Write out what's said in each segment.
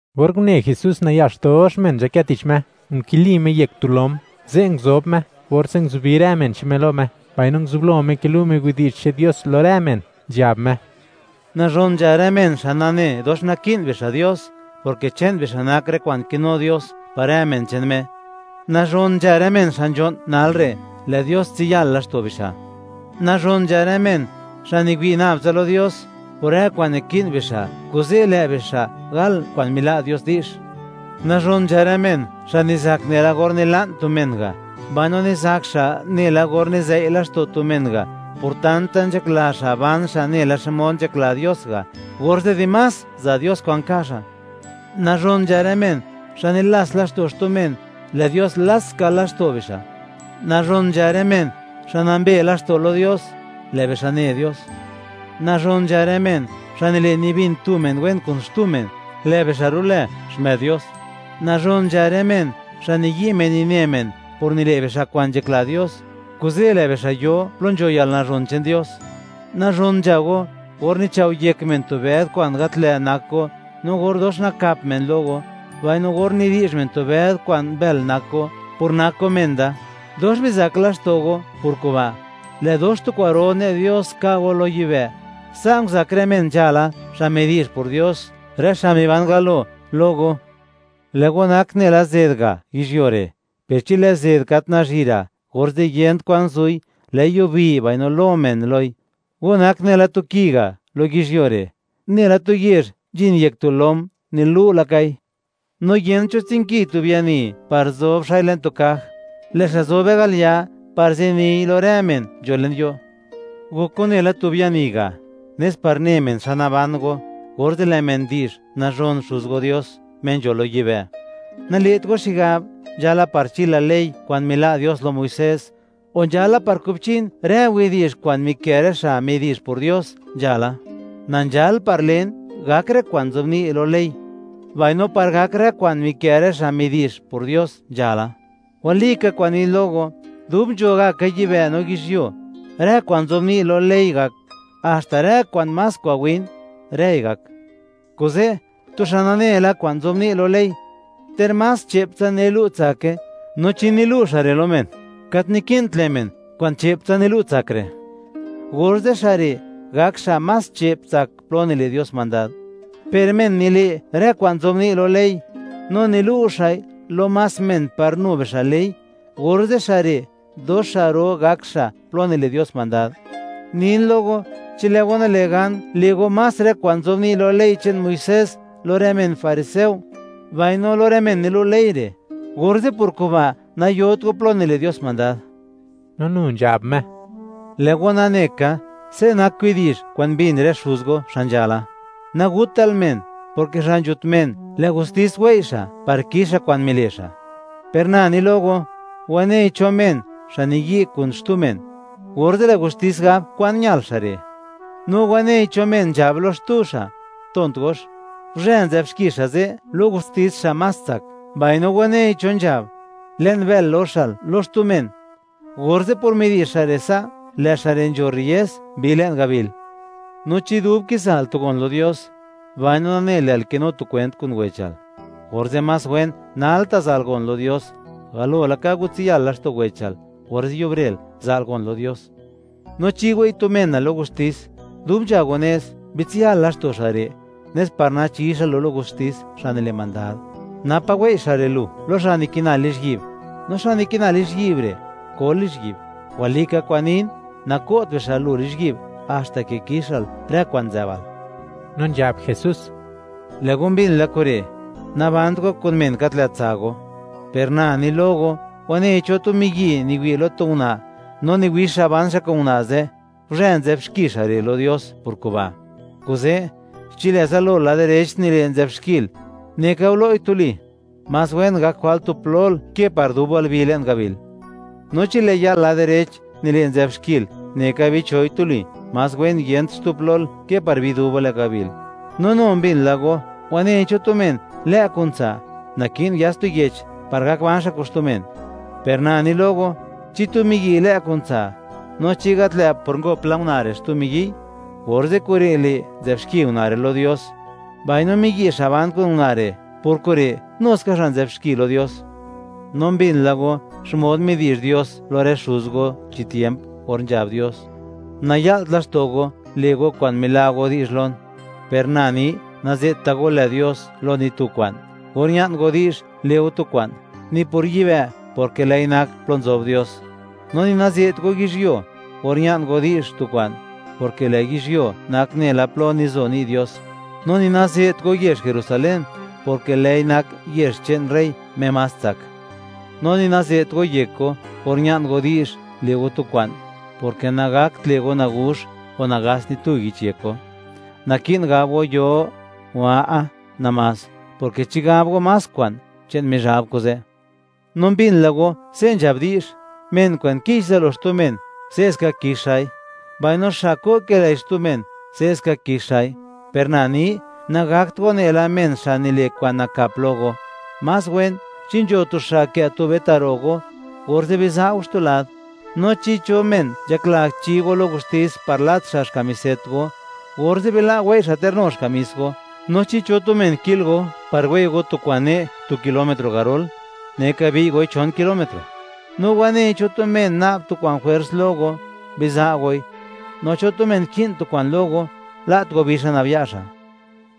Or une Jesús nayax dox men nzhakë tich Me, nkili Me yek tu lom, ze' nguzob Me, orze' nguzubi rë men che'n Me lo Me, mbaino nguzublo Me kilu' Me widi'zh che'n Dios lo rë men, nzhab Me: ―Nazhon nzha rë men xa' nane, dox naki'n bixa' Dios, porke che'n bixa' nak rë kwa'n kinu Dios par rë men che'n Me. ’Nazhon nzha rë men xa' nzho'n nalre'; lë' Dios tsiyal laxto' bixa'. ’Nazhon nzha rë men xa' niwi' nab tsa lo Dios por rë kwa'n naki'n bixa'; kuze' lë' bixa' gal kwa'n mila' Dios di'zh. ’Nazhon nzha rë men, xa' nizak nela or nila'n tu men ga', mbaino nizak xa' nela or nizëi' laxto' tu men ga', por tanta nzhakla xa' ban xa' nela xmod nzhakla Dios ga', orze' dimás za' Dios kwa'n ka' xa'. ’Nazhon nzha rë men xa' nilats laxto' xtu men; lë' Dios lats ska laxto' bixa'. ’Nazhon nzha rë men xa' nambe laxto' lo Dios; lë' bixa' ne Dios. ’Nazhon nzha rë men xa' nile' nibin tu men wen kun xtu men; lë bixa' ru'lë xmë'd Dios. ’Nazhon nzha rë men, xa' niyi' men nine men por nile' bixa' kwa'n nzhakla Dios; kuze' lë' bixa' yo plo nzho yalnazhon che'n Dios. ’Nazhon nzha go or nichao' yek men tu bëd kwa'n gat lë' nak go, no or dox nakap men lo go, mbaino or nidi'zh men tu bëd kwa'n mbël nak go, por nak go men da. Dox bizak laxto' go por kuba'; lë' dox tu kwa'ro ne' Dios ka' go lo yibë'. Sa' nguzak rë men nzhala xa' midi'zh por Dios, rë xa' miban galo lo go. ’Lë' go nak nela zed ga' yizhyuo re', per chi lë' zed gat nazhira', orze' yent kwan zu'i; lë'i yubi, mbaino lo men loi. ’Go nak nela tu ki ga' lo yizhyuo re', nela tu yezh nzhin yek tu lom nilu' lakai; no yent cho tsinki tu biani par zob xa'i le'n tu kaj; lë' xa' zobe al ya' par ziniy lo rë men nzho le'ño'. Gok go nela tu biani ga', nes par ne men xa naban go, orze' lë' men di'zh nazhon Xuz go Dios, Me nzho lo yibë'. ’Nale't go xigab, nzhala par chila ley kwa'n mila' Dios lo Muisés, o nzhala par kubchin rë widi'zh kwa'n mikë' rë xa' midi'zh por Dios nzhala; na nzhal par len, gak rë kwa'n nzobni' lo ley, mbaino par gak rë kwa'n mikë' rë xa' midi'zh por Dios nzhala. Walika kwa'n nin lo go, dub nzho gaka yibë' no yizhyuo, rë kwa'n nzobni' lo ley gak; haxta rë kwa'n más kwa'n win, rëi gak. Kuze', tu xa' nane la kwa'n nzobni' lo ley, ter más che'ptsa nilu' tsake, no chi nilu' xa' re' lo men, gat naki'nt le' men kwa'n che'ptsa nilu' tsak re', orze' xa' re' gak xa' más che'p tsak plo nile' Dios mandad. Per men nile' rë kwa'n nzobni' lo ley, no nilu' xa'i lo más men par nu bixa' le'i, orze' xa' re' dox xa' ro gak xa' plo nile' Dios mandad. Nin lo go, chi lë' go nale' gan le' go más rë kwa'n nzobni' lo ley che'n Muisés lo rë men fariseo, mbaino lo rë men nilu' ley re', orze' por kuba' nayot go plo nile' Dios mandad. No nu nzhab Me: ―Lë' go nane ka, se' nak widi'zh kwa'n mbin rë xuz go xa' nzhala: “Naguttal men, porke xa' nzhut men, lë' gustis wei' xa' par kix xa' kwa'n mile' xa'.” Per na ni lo go, wanei cho men, xa' niyi' kun xtu men, orze' lë' gustis gab kwan ñal xa' re'; no wanei cho men nzhab lo xtu xa': “Tont gox”, guzhë nzë'b xki xa' ze' lo gustis xa' más tsak; mbaino wanei cho nzhab: “Le'n bël loxal”, lo xtu men, orze' por midi'zh xa' re' sa', lë' xa' re' nzho rriez bi le'n gabil. ’No chi dub kiza'l tu gon lo Dios, mbaino nanel, lë'l kinu tu kwent kun wechal, orze' más wen nalta' za'l gon lo Dios, galo laka watsiya'l laxto' wechal, orze' yubre'l, za'l gon lo Dios. ’No chi wei' tu menal lo gustis, dub nzha go nez, bitsiyal laxto' xa' re', nes par nachi xa' lu lo gustis xa' nile' mandad, napa' wei' xa' re' lu lo xa' nikina lizhyi'b; no xa' nikina lizhyi'b re' kol lizhyi'b. Walika kwa'n nin, nako't bixa' lu lizhyi'b haxta ke kixal rë kwa'n nzë'bal. No nzhab Jesús: ―Lë' go mbin la kure': “Nabant go kun men gat lë' tsa' go.” Per na ni lo go, wanei cho tu miyi' niwi' lo tu una' no niwix xa' ban xa' kun una' ze', guzhë nzë'b xki xa' re' lo Dios por kuba'. Kuze', chi lë' zalol lad direch nile', nzë'b xkil, neka gulo'i tuli; más wen gak jwalt tu plol ke par dubal bi le'n gabil. No chi lë' ya'l lad direch nile' nzë'b xkil, neka bicho'i tuli; más wen yent xtu plol ke par bi dubal le'n gabil. ’No nu mbin la go: “Wanei cho tu men lë' kun tsa', naki'n yats tu yech par gak ban xa' kun xtu men.” Per na ni lo go, chi tu miyi' lë' kun tsa', no chi gat lë' por ngop la una' re' xtu miyi'y, orze' kure' le', nzë'b xki una' lo Dios, mbaino miyi' xa' ban kun una' re', por kure' nu ska xa' nzë'b xki lo Dios. ’No mbin la go xmod midi'zh Dios lo rë xuz go chi tiemp or nzhab Dios: “Naya'lt laxto' go, le' go kwa'n mila' go di'zh lon.” Per na ni, naze't go lë Dios lo ni tu kwa'n or ña'n go di'zh le' go tu kwa'n, ni por yibë', porke lë'i nak plo nzob Dios; no ni naze't go yizhyuo or ña'n go di'zh tu kwa'n, porke lë' yizhyuo nak nela plo nizo ni' Dios; no ni naze't go yezh Jerusalén, porke lë'i nak yezh che'n rey, Me más tsak. No ni naze't go yek go or ña'n go di'zh le' go tu kwa'n, porke nagakt le' go naguzh o nagats ni tu yich yek go. Naki'n gab go “Yoo”, o “A'a” namás, porke chi gab go más kwa'n, che'n Mizhab kuze'. ’No mbin la go se' nzhab di'zh: “Men kwa'n kich zalo xtu men, se'ska kix xa'i; mbaino xa' ko' kilëi xtu men, se'ska kix xa'i.” Per na ni, nagakt go nela men xa' nile' kwa'n nakap lo go; más wen chi nzho tu xa' kë' tube ta' ro' go, orze' biza' go xtu lad. No chi cho men nzhakla chi go lo gustis par lat xa' xkamiset go, orze' bila' go wei' xa' ter nu xkamis go. No chi tu men ki'l go par wei' go tu kwa'n ne' tu kilómetro garol, neka bi'y goi chon kilómetro; no wanei cho tu men na'b tu kwa'n jwers lo go, biza' goi; no cho tu men ki'n tu kwa'n lo go, la't go bi xa' nab ya' xa'.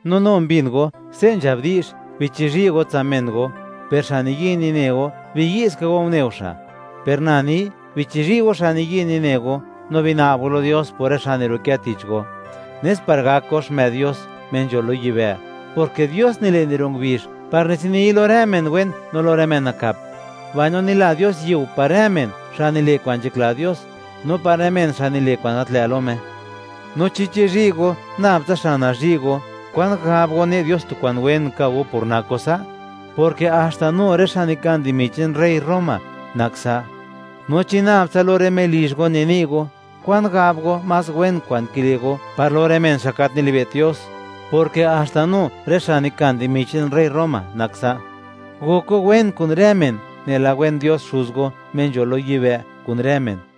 ’No nu mbin go se' nzhab di'zh: “Bichizhi' go tsa' men go, per xa' niyi' nine go, biyi' ska go, une go xa'.” Per na ni: Bichizhi' go xa' niyi' nine go, no bina'b go lo Dios por rë xa' niru'kë tich go, nes par gak go xmë'd Dios, Me nzho lo yibë'; porke Dios nile' niro' ngubizh par niziniy lo rë men wen no lo rë men nakap; mbaino nila Dios yiu par rë men, xa' nile' kwa'n nzhakla Dios no par rë men xa' nile' kwa'n gat lë' lo Me. No chi chizhi' go nab tsa xa' nazhi' go, ¿kwan gab go, ne' Dios tu kwa'n wen ka' go, por nak go sa'?, porke haxta nu rë xa' nikan dimi che'n rey Roma nak sa'. No chi nab tsa lo rë melizh go nini' go, ¿kwan gab go, más wen kwa'n kile' go, par lo rë men, xa' gat nilibe't Dios?, porke haxta nu rë xa' nikan dimi che'n rey Roma nak sa'. Gok go wen kun rë men, nela wen Dios Xuz go, Me nzho lo yibë', kun rë men.